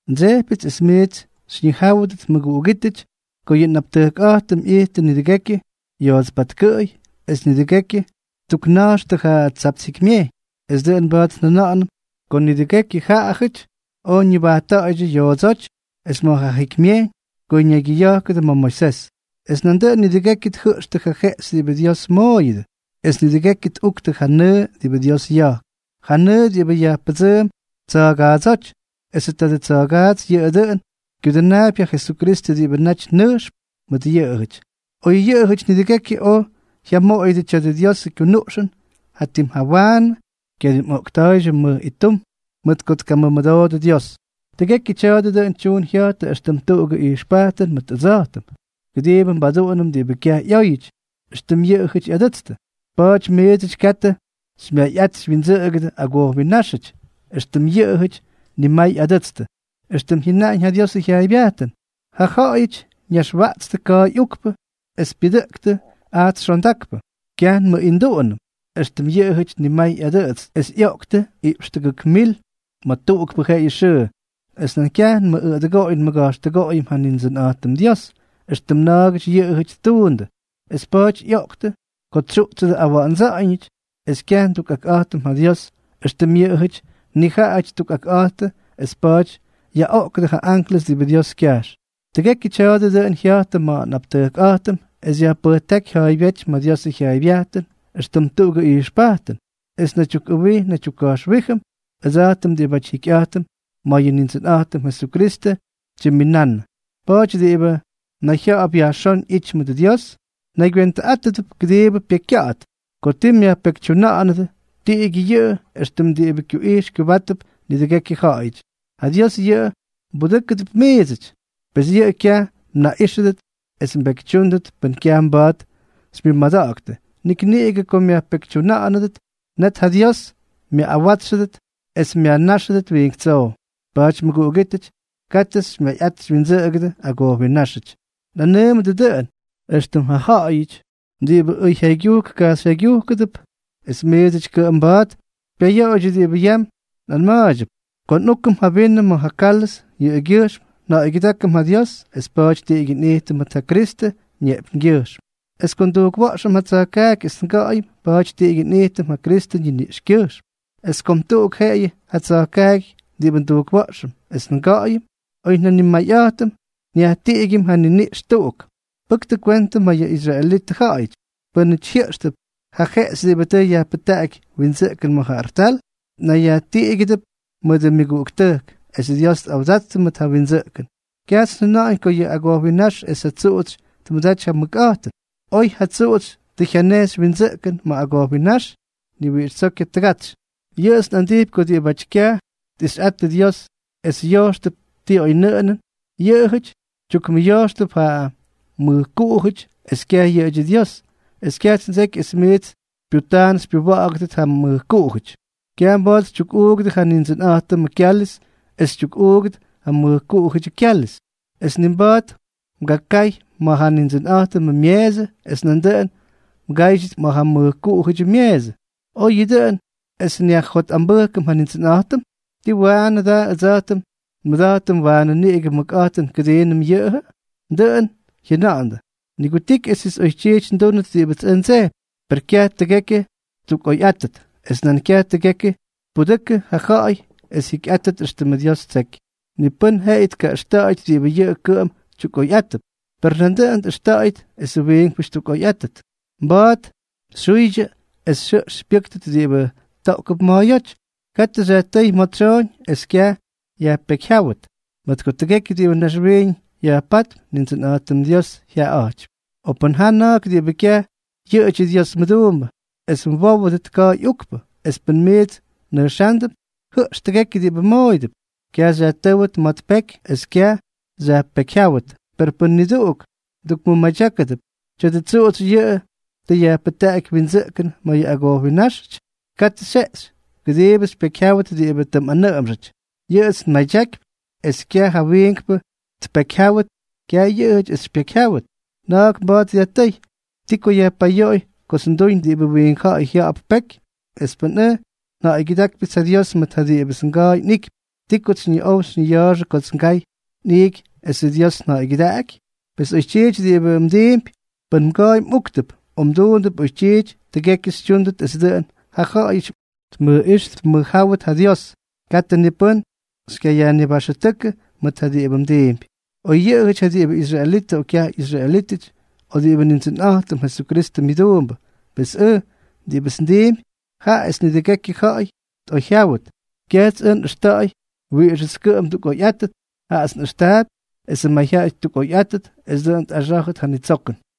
Ndsejpyʉts es miits xyñijáwʉdʉt mʉguꞌugítʉty, ko yʉ nꞌaptʉjkꞌa̱jtʉm ꞌyijttʉ nidʉgekyʉ yoots patkʉꞌʉy, es nidʉgekyʉ ttukna̱jxtʉ ja Tsapts Jikymyejyñ. Es dʉꞌʉn mba̱a̱t njʉna̱ꞌa̱nʉm ko nidʉgekyʉ jaꞌajʉty oj ñʉbajtta̱ꞌa̱ydyʉ yoodsóty es ma̱ ja jikymyejyñ ko ñaygyʉya̱jkʉdʉ ma̱ Moisés. Es nandʉꞌʉn nidʉgekyʉ tjʉꞌxtʉ ja jeꞌxy diꞌibʉ Dios mooyʉdʉ, es nidʉgekyʉ tꞌuktʉ ja nʉʉ diꞌibʉ Dios ya̱jk, ja nʉʉ diꞌibʉ yajpʉdsʉʉm tsa̱a̱gaadsóty; esʉ tadʉ tsa̱gaats yʉꞌʉ dʉꞌʉn kyudʉnaapy ja Jesukristʉ diꞌibʉ naty nʉjxp mʉt yʉꞌʉjʉty. Oy yʉꞌʉjʉty nidʉgekyʉ oj jyamoꞌoyʉdʉ tya̱dʉ Diosʉ kyunuꞌxʉn, jatim jawaanʉ kyadimꞌoꞌkta̱a̱ydyʉ mʉj ittum mʉt ko tkamʉmʉdoodʉ Dios. Tʉgekyʉ tya̱a̱dʉ dʉꞌʉn tyuun jya̱jtʉ éxtʉm tuꞌugʉ ijxpajtʉn mʉt ʉdsa̱jtʉm, kʉdiibʉ nbaduꞌunʉm diꞌibʉ kyaj ꞌyóyʉty, éxtʉm yʉꞌʉjʉty ꞌyadʉtstʉ. Pa̱a̱ty miidsʉty katʉ xymyayꞌat xywyindsʉꞌʉgʉdʉ agojwinnáxʉty, éxtʉm yʉꞌʉjʉty nimay ꞌyadʉtstʉ, éxtʉm jyʉnaꞌañ ja Diosʉ jyaaybyajtʉn: “Ja ja̱ꞌa̱yʉty ñaxwaꞌtstʉ ka̱a̱y ukpʉ, es pyʉdʉꞌʉktʉ ajts xondakpʉ.” Kyaj nmʉꞌinduꞌunʉm, éxtʉm yʉꞌʉjʉty nimay ꞌyadʉtstʉ, es ꞌyoꞌktʉ iꞌpx tʉgʉk mil ma̱ tuꞌukpʉ jeꞌeyʉ xʉʉ. Es nan kyaj nmʉꞌꞌʉdʉgoꞌoy nmʉga̱jxtʉgoꞌoyʉm ja Nindsʉnꞌa̱jtʉm Dios, éxtʉm na̱a̱gʉty yʉꞌʉjʉty ttuundʉ, es pa̱a̱ty ꞌyoꞌktʉ ko tsyuꞌtsʉdʉ awa̱ꞌa̱ndsa̱ꞌa̱ñʉty. Es kyaj ndukꞌakꞌa̱jtʉm ja Dios, éxtʉm yʉꞌʉjʉty nijaꞌajʉty ttukꞌakꞌa̱jttʉ, es pa̱a̱ty yaꞌoꞌkʉdʉ ja anklʉs diꞌibʉ Dios kyajx. Tʉgekyʉ tya̱a̱dʉ dʉꞌʉn jya̱jtʉ ma̱ nꞌaptʉjkꞌa̱jtʉm es yajpʉjtáky ja̱a̱ybyéty ma̱ Diosʉ jyaaybyajtʉn éxtʉm tuꞌugʉ ijxpajtʉn, es nnaydyukꞌʉwij nnaydyukka̱jxwíjʉm, ʉdsa̱jtʉm diꞌibáty jikyꞌa̱jtʉm ma̱ yʉ Nindsʉnꞌa̱jtʉm Jesukristʉ tyimminannʉ. Pa̱a̱ty diꞌibʉ nayjya̱ꞌa̱p yajxón ꞌyity mʉdʉ Dios, naygywentʉꞌátʉdʉp kʉdiibʉ pyekykya̱ꞌa̱t. Ko ti myajpekytyuna̱ꞌa̱nʉdʉ, tiꞌigyʉ yʉꞌʉ éxtʉm diꞌibʉ kyuꞌijx kyubátʉdʉp nidʉgekyʉ ja̱ꞌa̱yʉty. Ja Dios yʉꞌʉ mbudʉ́kʉdʉp miidsʉty, pes yʉꞌʉ kyaj mnaꞌíxʉdʉt es mbekytyúndʉt pʉn kyaj mba̱a̱t xymyʉmada̱ꞌa̱ktʉ; nik niꞌigʉ ko myajpekytyuna̱ꞌa̱nʉdʉ, net ja Dios myaꞌꞌawátsxʉdʉt es myajnáxʉdʉt wiink tsow. Pa̱a̱ty mʉguꞌugítʉty, katʉ xymyayꞌat xywyindsʉꞌʉgʉdʉ agojwinnáxʉty. Nꞌanʉʉmʉdʉ dʉꞌʉn, éxtʉm ja ja̱ꞌa̱yʉty diꞌibʉ ʉyjyaygyujk kajxyjyaygyujkʉdʉp, es miidsʉty kʉꞌʉm mba̱a̱t xypyayoꞌoydyʉ diꞌibʉ yam nꞌanma̱a̱ydyʉp. Ko nꞌúkʉm ja vinʉ ma̱ ja kálʉz, yʉꞌʉgyʉjxm nja̱ꞌa̱ygyʉdákʉm ja Dios, es pa̱a̱ty tiꞌigyʉ nꞌijtʉm mʉt ja Kristʉ ñeꞌpyñgyʉjxm; es ko ndujkwa̱ꞌxʉm ja tsa̱jkaaky es nga̱ꞌa̱yʉm, pa̱a̱ty tiꞌigyʉ nꞌijtʉm ja Kristʉ ñiniꞌxkyʉjxm. Pes kom tuꞌuk jeꞌeyʉ ja tsa̱jkaaky diꞌibʉ ndujkwa̱ꞌxʉm es nga̱ꞌa̱yʉm; oy njanimayꞌa̱jtʉm, nyajtiꞌigyʉm ja niniꞌx tuꞌuk. Pʉktʉ kwentʉ ma̱ yʉ israelitʉ ja̱ꞌa̱yʉty. Pʉ́nʉty jyʉꞌxtʉp ja jeꞌxy diꞌibʉ tʉ yajpʉjtaꞌaky windsʉꞌkʉn ma̱ ja artal, nayyajtiꞌigʉdʉp mʉdʉ myʉguꞌuktʉjk es Dios tꞌawdattʉ ma̱ ja windsʉꞌkʉn. Kyajts njʉna̱ꞌa̱ñ ko yʉ agojwinnáx es ja tsuꞌutsy tmʉdaty ja mʉkꞌa̱jtʉn. Oy ja tsuꞌutsy tʉ jyanejxy windsʉꞌkʉn ma̱ agojwinnáx, ni wiꞌix tsoo kyatʉgatsy. Yʉꞌʉts nꞌandijpy ko diꞌibáty kyaj tꞌixyꞌattʉ Dios es yojxtʉp ti oynʉꞌʉnʉn, yʉꞌʉjʉty tyukmʉyojxtʉp ja mʉjkuꞌujʉty, es kyaj yʉꞌʉdyʉ Dios, es kyajts ndseky es miits xypyutaan xypyuwa̱ꞌa̱ktʉt ja mʉjkuꞌujʉty. Kyaj mba̱a̱t xytyukꞌuugʉdʉ ja Nindsʉnꞌa̱jtʉmʉ kyáliz es xytyukꞌuugʉdʉ ja mʉjkuꞌujʉdyʉ kyáliz, es ni mba̱a̱t mgakay ma̱ ja Nindsʉnꞌa̱jtʉmʉ myeesʉ es nandʉꞌʉn mgáydyʉt ma̱ ja mʉjkuꞌujʉdyʉ myeesʉ. ¿O yʉꞌʉ dʉꞌʉn es nyajjotꞌambʉjkʉm ja Nindsʉnꞌa̱jtʉm? ¿Tii waꞌanʉ da ʉdsa̱jtʉm nmʉda̱jtʉm waanʉ niꞌigʉ mʉkꞌa̱jtʉn kʉdiinʉm yʉꞌʉjʉ? Dʉꞌʉn jyʉna̱ꞌa̱ndʉ: “Nigutiky esʉts oytyiity ndúnʉt diꞌibʉts ndsejpy”; per kyaj tʉgekyʉ ttukꞌoyꞌátʉt, es nan kyaj tʉgekyʉ tpudʉkʉ ja ja̱ꞌa̱y es jyikyꞌáttʉt éxtʉmʉ Dios ttseky. Ni pʉ́n jeꞌeyʉ tkaꞌʉxta̱ꞌa̱yʉt diꞌibʉ yʉꞌʉ kʉꞌʉm tyukꞌoyꞌátʉp, per nandʉꞌʉn tꞌʉxta̱ꞌa̱yʉt esʉ wiinkpʉty ttukꞌoyꞌáttʉt. Mba̱a̱t xyjuydyʉ es xyjʉꞌx xypyʉ́ktʉt diꞌibʉ toꞌkʉp ma̱a̱yóty, katʉ xyajtʉ́y ma̱ tsyooñ es kyaj yajpekyjyáwʉt; mʉt ko tʉgekyʉ diꞌibʉ naxwiiñ yajpátp, Nindsʉnꞌa̱jtʉm Diosʉ jyaꞌaꞌa̱jtypy. O pʉn jaa na̱a̱k diꞌibʉ kyaj yʉꞌʉdyʉ Dios mʉduumbʉ es mwówʉdʉt ka̱a̱y ukpʉ, es pʉn miits mnʉjxándʉp, jʉꞌx tʉgekyʉ diꞌibʉ mmooyʉdʉp. Kyaj xyajtʉ́wʉt ma̱ tpeky es kyaj yajpekyjyáwʉt. Per pʉn niduꞌugʉty mdukmʉmadyákʉdʉp: “Tya̱dʉ tsuꞌutsy yʉꞌʉ tʉ yajpʉjtaꞌaky windsʉꞌkʉn ma̱ yʉ agojwinnáxʉty”, katʉ xyjeꞌxy, kʉdiibʉ tpekyjyáwʉt diꞌibʉ tʉ mꞌanʉꞌʉmxʉty. Yʉꞌʉts nmadyakypy es kyaj ja wiinkpʉ tpekyjyáwʉt, kyaj yʉꞌʉjʉty es xypyekyjyáwʉt. Na̱a̱k mba̱a̱t dyajtʉ́y: “¿Ti ko yajpayoꞌoy kots nduñ diꞌibʉ wiink ja̱ꞌa̱y jya̱ꞌa̱p peky? Es pʉn ʉj nja̱ꞌa̱ygyʉdákypyʉts ja Dios mʉt ja diꞌibʉts nga̱a̱y nꞌiꞌkypy, ¿ti kots xyñiꞌow xyñiya̱a̱xʉ kots ngay nꞌiiky esʉ Dios nja̱ꞌa̱ygyʉdaꞌaky?” Pes oytyiity diꞌibʉ mdiimpy, pʉn mga̱a̱y mꞌúktʉp, o mduundʉp oytyiity, tʉgekyʉ xytyúndʉt es dʉꞌʉn ja ja̱ꞌa̱yʉty tmʉjꞌíx tmʉjjáwʉt ja Dios. Katʉ ni pʉ́n xykyayajnibaxʉtʉ́kʉ mʉt ja diꞌibʉ mdiimpy, oyyʉꞌʉjʉty ja diꞌibʉ israelitʉ o kyaj ꞌyisraelítʉty, o diꞌibʉ Nindsʉnꞌa̱jtʉm Jesukristʉ myʉduumbʉ. Pes ʉj, diꞌibʉts ndiimpy, jaꞌa es nidʉgekyʉ ja̱ꞌa̱y tꞌoyjyáwʉt; kyajts ʉj nꞌʉxta̱ꞌa̱y wiꞌixʉts kʉꞌʉm ndukꞌoyꞌátʉt, jaꞌats nꞌʉxtaapy esʉ mayjyaꞌay ttukꞌoyꞌáttʉt es dʉꞌʉn tꞌaxá̱jʉdʉt ja nitsokʉn.